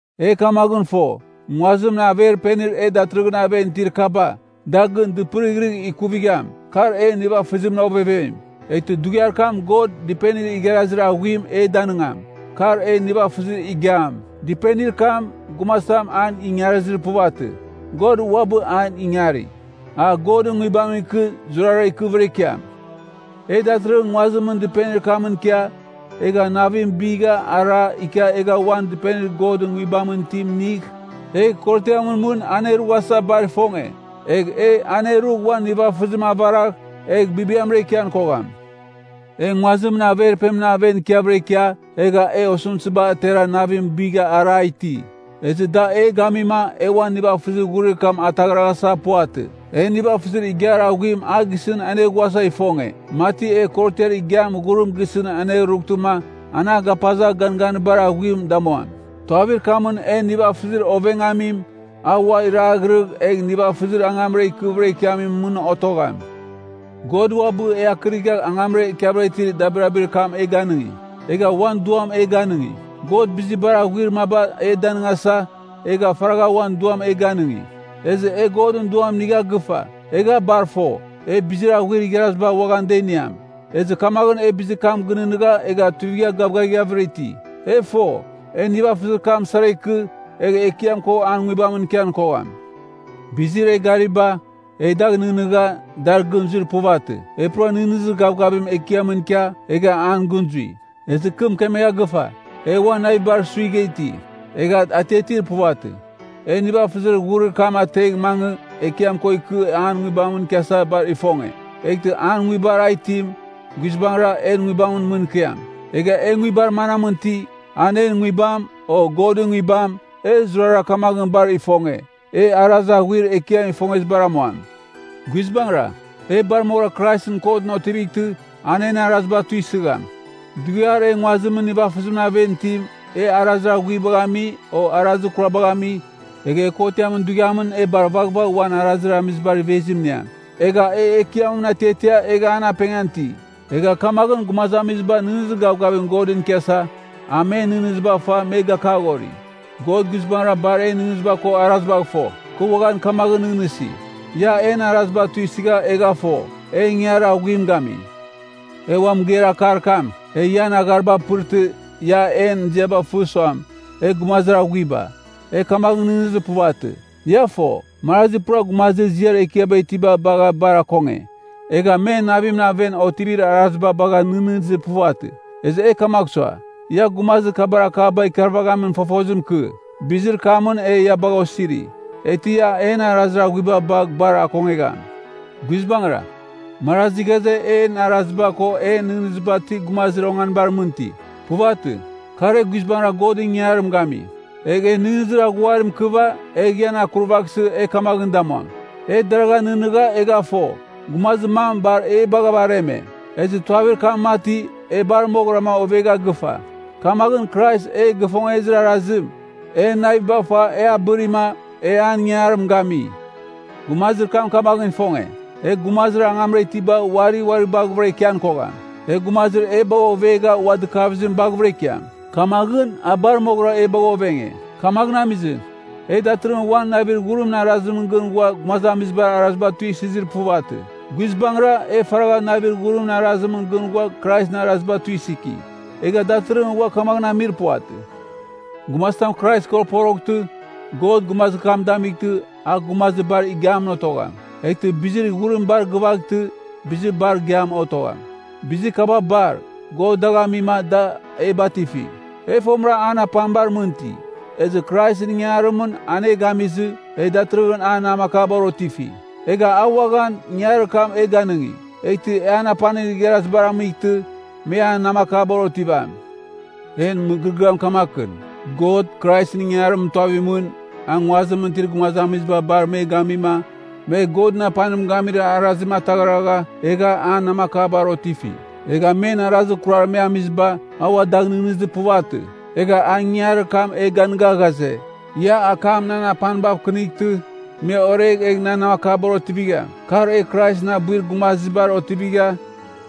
E kamaghɨn fo, nguazimɨn averpenir e datɨrɨghɨn aven itir kaba, da gɨn dɨpɨrighrɨgh ikuvigham, kar en nivafɨzimɨn ovevem. Eghtɨ dughiar kam God dɨpenir igharazir aghuim e danɨngam, kar en nivafɨzir igiam. Dɨpenir kam, gumazitam an ingarizir puvatɨ, God uabɨ an ingari. A Godɨn Nguibamɨn ikɨ zurazurara ikɨvɨra ikiam. E datɨrɨghɨn nguazimɨn dɨpenir kamɨn ikia, egha navim bigha ara ikia egha uan dɨpenir Godɨn Nguibamɨn itim inigh, egh korotiamɨn mɨn e anerughasa bar ifonge. Egh e anerugh uan nivafɨzim avaragh, egh bibiamra ikian kogham. E nguazimɨn averpenimɨn aven ikiavɨra ikia, egha e osɨmtɨziba atera navim bigha ara iti. Ezɨ da e gamima e uan nivafɨzir ghurir kam ataghraghasa puvatɨ. E nivafɨzir igiar aghuim a gisɨn aneghuasa ifonge, mati e korotiar igiam ghurim gisɨn anerughtɨma, anagapazagh ganganir bar aghuim damuam. Tuavir kamɨn en nivafɨzir ovengamim, a ua iraghɨrɨgh, egh nivafɨzir angamra ikɨvɨra ikiamim mɨn otogham. God uabɨ e akɨrigha angamra ikiavɨra itir dabirabir kam e ganɨngi, egha uan Duam e ganɨngi. God bizir bar aghuir maba e danɨngasa, egha faragha uan Duam e ganɨngi. Ezɨ e Godɨn Duam inigha gɨfa, egha bar fo, e bizir aghuir igharaziba uaghan da iniam. Ezɨ kamaghɨn e bizir kam gɨnɨghnɨgha egha tuivigha gavgavighavɨra iti. E fo, e nivafɨzir kam sara ikɨ, egh Ekiam ko an Nguibamɨn ikian kogham. Bizir e gariba, e dagh nɨghnɨgha, dar gɨn zuir puvatɨ. E pura nɨghnɨzir gavgavim Ekiamɨn ikia, egha an gɨn zui. Ezɨ kɨ mɨkemegha gɨfa, e uan navibar suigha iti, egha atiatir puvatɨ. E nivafɨzir ghurir kam ategh mangɨ Ekiam ko ikɨ an Nguibamɨn ikiasa bar ifonge. Eghtɨ an Nguibar a itim, guizbangɨra en nguibamɨn mɨn ikiam. Egha e nguibar manamɨn iti, an en nguibam, o Godɨn Nguibam, e zurara kamaghɨn bar ifonge, e arazir aghuir Ekiam ifongezibar amuam. Guizbangɨra, e bar moghɨra Kraisɨn kotɨn otivightɨ, an en araziba tuisɨgham. Dughiar e nguazimɨn nivafɨzimɨn aven itim, e arazir aghuibagh ami, o arazir kurabagha ami, egh kotiam dughiamɨn e bar vaghvagh uan arazir amizibar ivezim iniam. Egha e Ekiamɨn atiatia egha an apengan iti. Egha kamaghɨn gumazamiziba nɨghnɨzir gavgavim Godɨn ikiasa, e men nɨghnɨziba fa me gakaghori. God guizbangɨra bar en nɨghnɨziba ko arazibagh fo. Kɨ uaghan kamaghɨn nɨghnɨsi, ia en araziba tuisɨgha egha fo, e ingangarir aghuim gami. E ua mɨgeir akar kam, e ian aghariba apɨrtɨ, ia en ziaba fɨ suam, e gumazir aghuiba, e kamaghɨn nɨghnɨzir puvatɨ. Ia fo, marazi pura gumazibar ziar ekiaba itiba bagha bar akonge, egha men navimɨn aven otivir araziba bagh nɨghnɨzir puvatɨ. Ezɨ e kamagh sua, ia gumazir kabar akaba ikarvaghamin fofozim ikɨ. Bizir kamɨn e ia bagha osiri, eghtɨ ia en arazir aghuiba bagh bar akongegham. Guizbangɨra, marazi ghaze, en araziba ko en nɨghnɨziba ti gumazir onganibar mɨn iti. Puvatɨ, kar e guizbangɨra Godɨn ingangarim gami. Egh e nɨghnɨzir aghuarim ikɨva, egh ian akurvaghsɨ e kamaghɨn damuam. E deragha nɨghnɨgha egha fo, gumazir mam bar e bagha areme. Ezɨ tuavir kam mati, e bar moghɨrama ovegha gɨfa. Kamaghɨn Krais e gifongezir arazim, en naviba fa e abɨrima, e an ingangarim gami. Gumazir kam kamaghɨn ifonge, e gumazir angamra itiba uari uari baghɨvɨra ikian kogham. E gumazir e bagha ovegha ua dɨkavizim baghɨvɨra ikiam. Kamaghɨn, a bar moghɨra e bagha ovenge. Kamaghɨn amizɨ, e datɨrɨghɨn uam navir ghurimɨn arazimɨn gɨn ghua gumazamizibar araziba tuisɨzir puvatɨ. Guizbangɨra, e faragha navir ghurimɨn arazimɨn gɨn ghua Kraisɨn araziba tuisɨki. Egha datɨrɨghɨn ua kamaghɨn amir puvatɨ. Gumazitam Krais ko poroghtɨ, God gumazir kam damightɨ, a gumazir bar igiam otogham. Eghtɨ bizir ghurim bar gɨvaghtɨ, bizir bar igiam otogham. Bizir kaba bar, God dagh amima, da e batifi. E fomɨra an apanibar mɨn iti, ezɨ Kraisɨn ingangarimɨn an e gamizɨ, e datɨrɨghɨn an namakabar otifi. Egha a uaghan, ingangarir kam e ganɨngi, eghtɨ an apanir igharazibar amightɨ, me an namakabar otivam. En mɨgɨrɨgɨam kamakɨn: God, Kraisɨn ingangarimɨn tuavimɨn, a nguazimɨn itir gumazamiziba bar me gamima, me Godɨn apanim gamir arazim ataghragha, egha an namakabar mɨn otifi. Egha men arazir kurar me amiziba, a ua dagh nɨghnɨzir puvatɨ. Egha a ingangarir kam e ganɨga ghaze, ia akam nan apanibav kɨnightɨ, me oregh egh nan namakabar otivigham. Kar e Kraisɨn abuir gumazibar otivigha,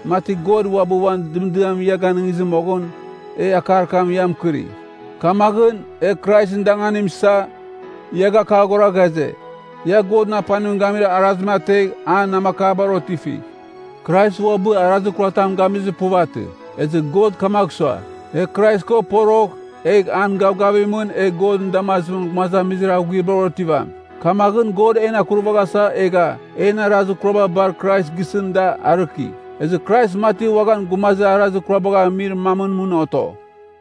mati God uabɨ uan dɨmdiam ia ganɨngizɨ moghɨn, e akar kam ia mɨkɨri. Kamaghɨn, e Kraisɨn danganim isa, ia gakaghora ghaze, ia Godɨn apanim gamir araziba ategh an namakabar otifigh. Krais uabɨ arazir kuratam gamizir puvatɨ. Ezɨ God kamagh sua, e Krais ko porogh, egh an gavgavimɨn e Godɨn damazimɨn gumazamizir aghuibar otivam. Kamaghɨn, God en akurvaghasa egha, en arazir kuraba bar Krais gisɨn da arɨki, ezɨ Krais mati uaghan gumazir arazir kurabagh amir mamɨn mɨn oto.